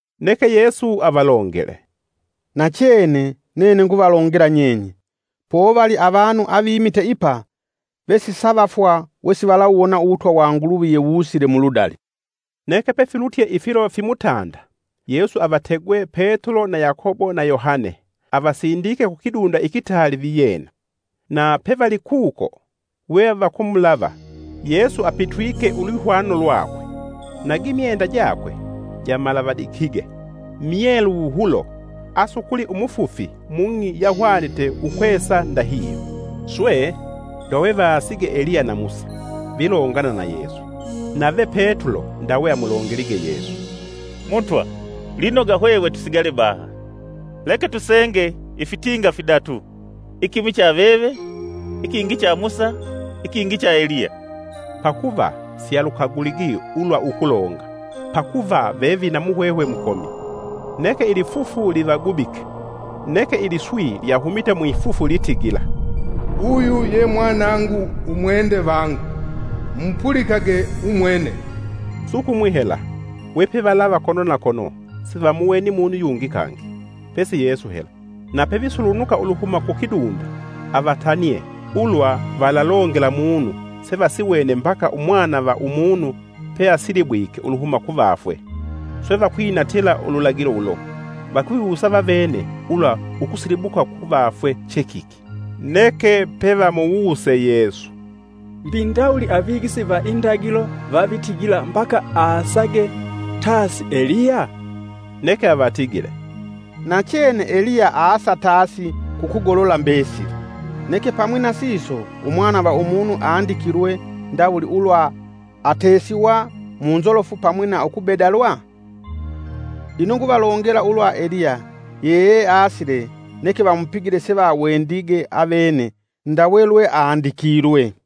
Neke Yesu avalongele, “Nachene nene nguvalongela nyenye, povali avanu avimite ipa vesisavafwa wesi valawuwona Uwutwa wa Nguluvi yewusile muludali.” Neke pefilutye ifilo fimutanda Yesu avategwe Petulo na Yakobo na Yohane avasindike kukidunda ikitaali viyena. Na pevalikuko we vakumulava, Yesu apitwike ulwihwano lwakwe, na gimyenda jakwe jamalavadikige, myelu wuhulo, asukuli umufufi mung'i yahwanite ukwesa ndahihyo. Swe, ndawe vaasige Eliya na Musa, vilongana na Yesu. Nave Petulo ndawe amulongelige Yesu, “Mutwa, lwinoga hwehwe tusigale baha. Leke tusenge ifitinga fidatu: ikimwi cha veve, ikingi cha Musa, ikingi cha Eliya.” Pakuva sialukaguligi ulwa ukulonga, pakuva vevina muhwehwe mukomi. Neke ilifufu livagubike, neke iliswi lyahumite mwifufu litigila, “Uyu ye Mwanangu umwende vangu, mumupulikage umwene.” Sukumwi hela we pevalava kono na kono sivamuweni munu yungi kangi pesi Yesu hela. Na pevisulunuka uluhuma kukidunda avatanie ulwa valalongela munu sevasiwene mbaka Umwana va Umunu peasilibwike uluhuma kuvafwe. Swe vakwinatila ululagilo ulo, vakwiwusa vavene ulwa ukusilibuka kuvafwe che kiki. Neke pevamuwuse Yesu, “Mbi ndawuli avigisi va indagilo vavitigila mbaka asaage tasi Eliya?” Neke avatigile, “Nachene Eliya aasa tasi kukugolola mbesili, neke pamwi na siso Umwana va Umunu andikilwe ndawuli ulwa atesiwa mu nzolofu pamwi na ukubedalwa? Ino nguvalongela ulwa Eliya yeeasile neke vamupigile sevawendige avene ndawe lwe andikilwe.”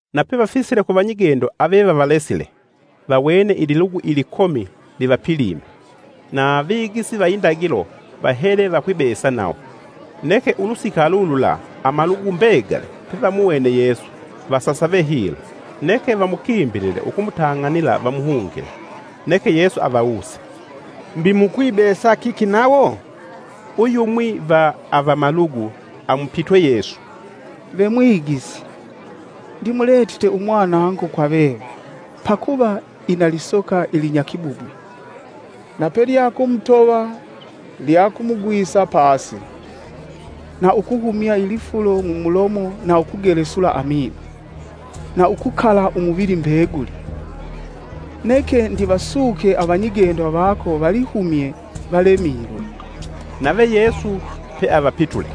Na pevafisile ku vanyigendo avevavalesile vawene ililugu ilikomi livapilime. Na avigisi va indagilo vahele vakwibesa nawo. Neke ulusika lulula amalugu mbegali pevamuwene Yesu vasasave hilo, neke vamukimbilile ukumutang'anila vamuhungile. Neke Yesu avawuse, “Mbi mukwibesa kiki nawo?” Uyumwi va avamalugu amupitwe Yesu, “Ve Mwigisi, ndimuletite umwanangu kwa veve, pakuva ina lisoka ilinyakibubwi. Na pelyakumutova lyakumugwisa pasi, na ukuhumya ilifulo mumulomo na ukugelesula amino, na ukukala umuvili mbeguli. Neke ndivasuke avanyigendo vako valihumye valemilwe.” Nave Yesu peavapitule,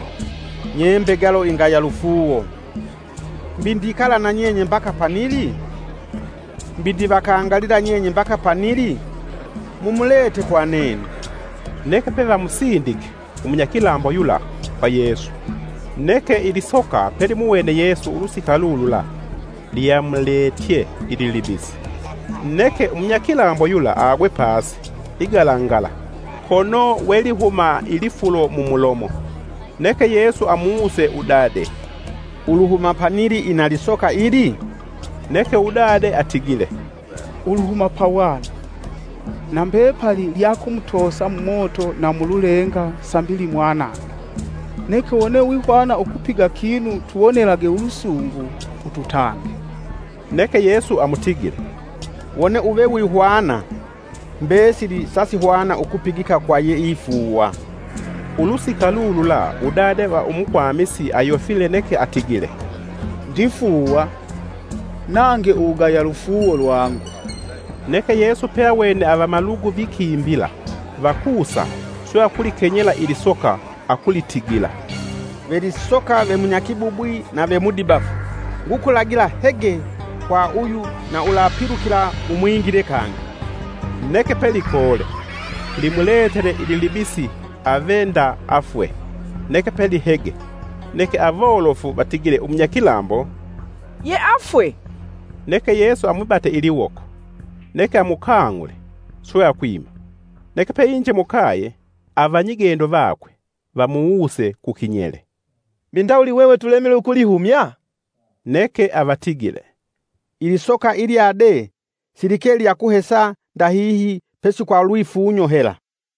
“Nye mbegalo ingaya lufuuwo. Mbi ndikala na nyenye mbaka panili? Mbi ndivakangalila nyenye mbaka panili? Mumulete kwa nene.” Neke pevamusindike umunyakilambo yula kwa Yesu. Neke ilisoka pelimuwene Yesu ulusika lulula lyamuletye ililibisi, neke umunyakilambo yula agwe pasi igalangala, kono we lihuma ilifulo mumulomo. Neke Yesu amuwuse udade, “Uluhuma panili ina lisoka ili?” Neke udade atigile, “Uluhuma pawana. Na mbepali lyakumutoosa mumoto na mululenga sambi limwanange. Neke wone wihwana ukupiga kinu tuwonelage ulusungu ututange!” Neke Yesu amutigile, “Wone uve wihwana! Mbesili sasihwana ukupigika kwa yeifuuwa.” Ulusika lulula udade va umukwamisi ayofile neke atigile, “Ndifuuwa! Nange uwugaya lufuuwo lwangu.” Neke Yesu peawene avamalugu vikimbila vakusa swe akulikenyela ilisoka akulitigila, “Ve lisoka ve munyakibubwi na ve mudibafu, ngukulagila hege kwa uyu na ulapilukila umwingile kangi!” Neke pe likoole, limuletele ililibisi ave nda afwe neke pelihege. Neke awolofu vatigile umunyakilambo, “yeafwe!” Neke Yesu amwibate iliwoko, neke amukang'ule, swe akwima. Neke peinje mukaye, avanyigendo vakwe vamuwuse kukinyele, “Mbi ndawuli hwehwe tulemilwe ukulihumya?” Neke avatigile, “Ilisoka ilya de silike lyakuhesa ndahihi pesi kwa lwifunyo hela.”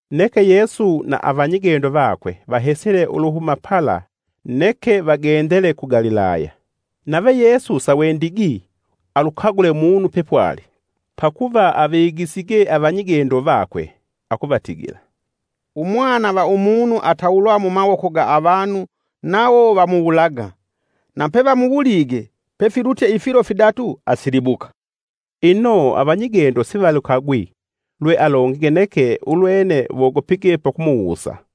Neke Yesu na avanyigendo vakwe vahesile uluhuma pala neke vagendele ku Galilaya. Nave Yesu sawendigi alukagule munu pepwali, pakuva avigisige avanyigendo vakwe, akuvatigila, “Umwana va Umunu atawulwa mumawoko ga avanu nawo vamuwulaga; na pevamuwulige pefilutye ifilo fidatu asilibuka.” Ino avanyigendo sivalukagwi lwe alongige neke ulwene wogopige pakumuwusa.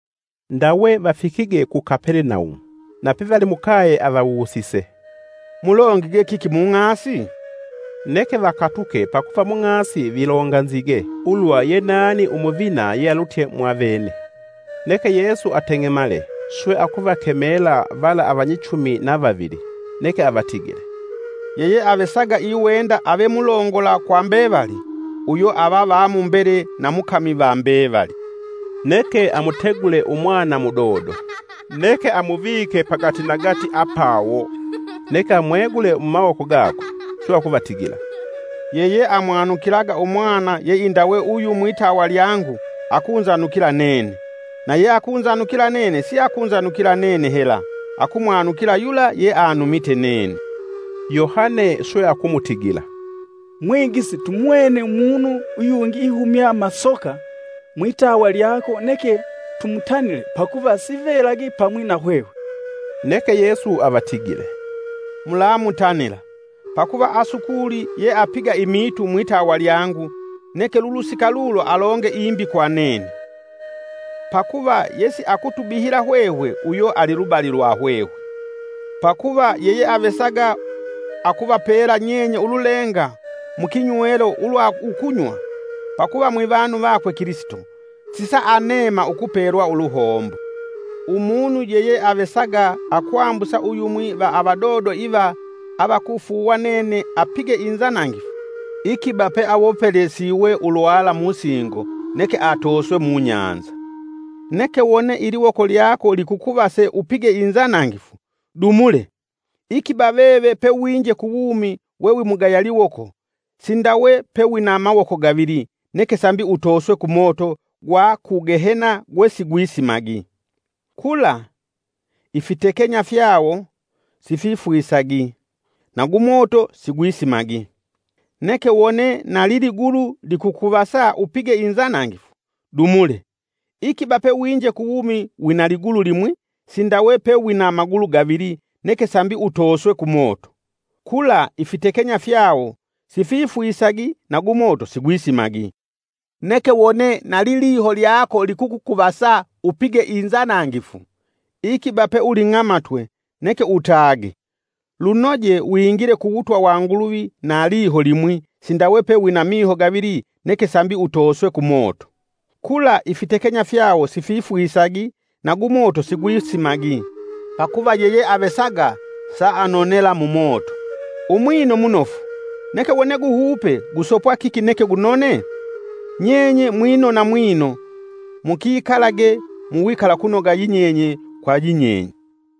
Ndawe vafikige ku Kapelenaumu. Na pealimukaye avawusise, “Mulongige kiki mung'asi?” Neke vakatuke pakuva mung'asi vilonganzige ulwa yenani umuvina yealutye mwa veve. Neke Yesu ateng'emale swe akuvakemela vala avanyichumi na vavili, neke avatigile, “Yeyeavesaga iwenda ave mulongola kwa mbevali uyo ava va mumbele na mukami va mbevali.” Neke amutegule Umwana mudodo, neke amuvike pagatinagati apawo; neke amwegule mumawoko gakwe swe akuvatigila, “Yeye amwanukilaga umwana yeindawe uyu mwitawa lyangu akunzanukila nene, na yeakunzanukila nene siakunzanukila nene hela, akumwanukila yula yeanumite nene.” Yohane swe akumutigila, “Mwigisi tumuwene umunu yungi ihumya masoka mwitawa lyako neke tumutanile pakuva sivelagi siayiva pamwi na hwehwe.” Neke Yesu avatigile, “Mulamutanila, pakuva asukuli yeapiga imiitu mwitawa lyangu neke lulusika lulo alonge imbi kwa nene. Pakuva yesiakutubihila hwehwe uyo alilubali lwa hwehwe. Pakuva, yeyeavesaga akuvapela nyenye ululenga mu kinywelo ulwa ukunywa pakuva mwivanu vakwe Kilisito sisaaneema ukupelwa uluhombo.” “Umunu yeyeavesaga akwambusa uyumwi va avadodo iva avakufuuwa nene apige inzanangifu, ikiba peawopelesewe ulwala musingo neke atooswe mubahali. Neke wone iliwoko lyako likukuvase upige inzanangifu, dumule! Ikiba veve pewinje kuwumi we wimugaya liwoko sindawe pe wina mawoko gavili neke sambi utoswe kumoto gwa ku Gehena gwe sigwisimagi. [ Kula, ifitekenya fyawo sififwisagi, na gumoto sigwisimagi.] Neke wone na liligulu likukukuvasa upige inzanangifu, dumule! Ikiba pewinje kuwumi wina ligulu limwi sindawe pe wina magulu gavili neke sambi utoswe kumoto. [ Kula, ifitekenya fyawo sififwisagi na gumoto sigwisimagi.] Neke wone na liliho lyako likukukuvasa upige inzanangifu ikiba peuling'amatwe neke utage! Lunoje wingile ku wutwa wa Nguluvi na liho limwi sindawe pe wina miho gavili neke sambi utoswe kumoto. Kula ifitekenya fyawo sififwisagi na gumoto sigwisimagi. “Pakuva yeyeavesaga saafungiswa mumoto. Umwino munofu, neke wone guhupe gusopwa kiki neke gunone? Nyenye mwinona mwino, mukikalage mu wikalakunoga yinyenye kwa yinyenye.”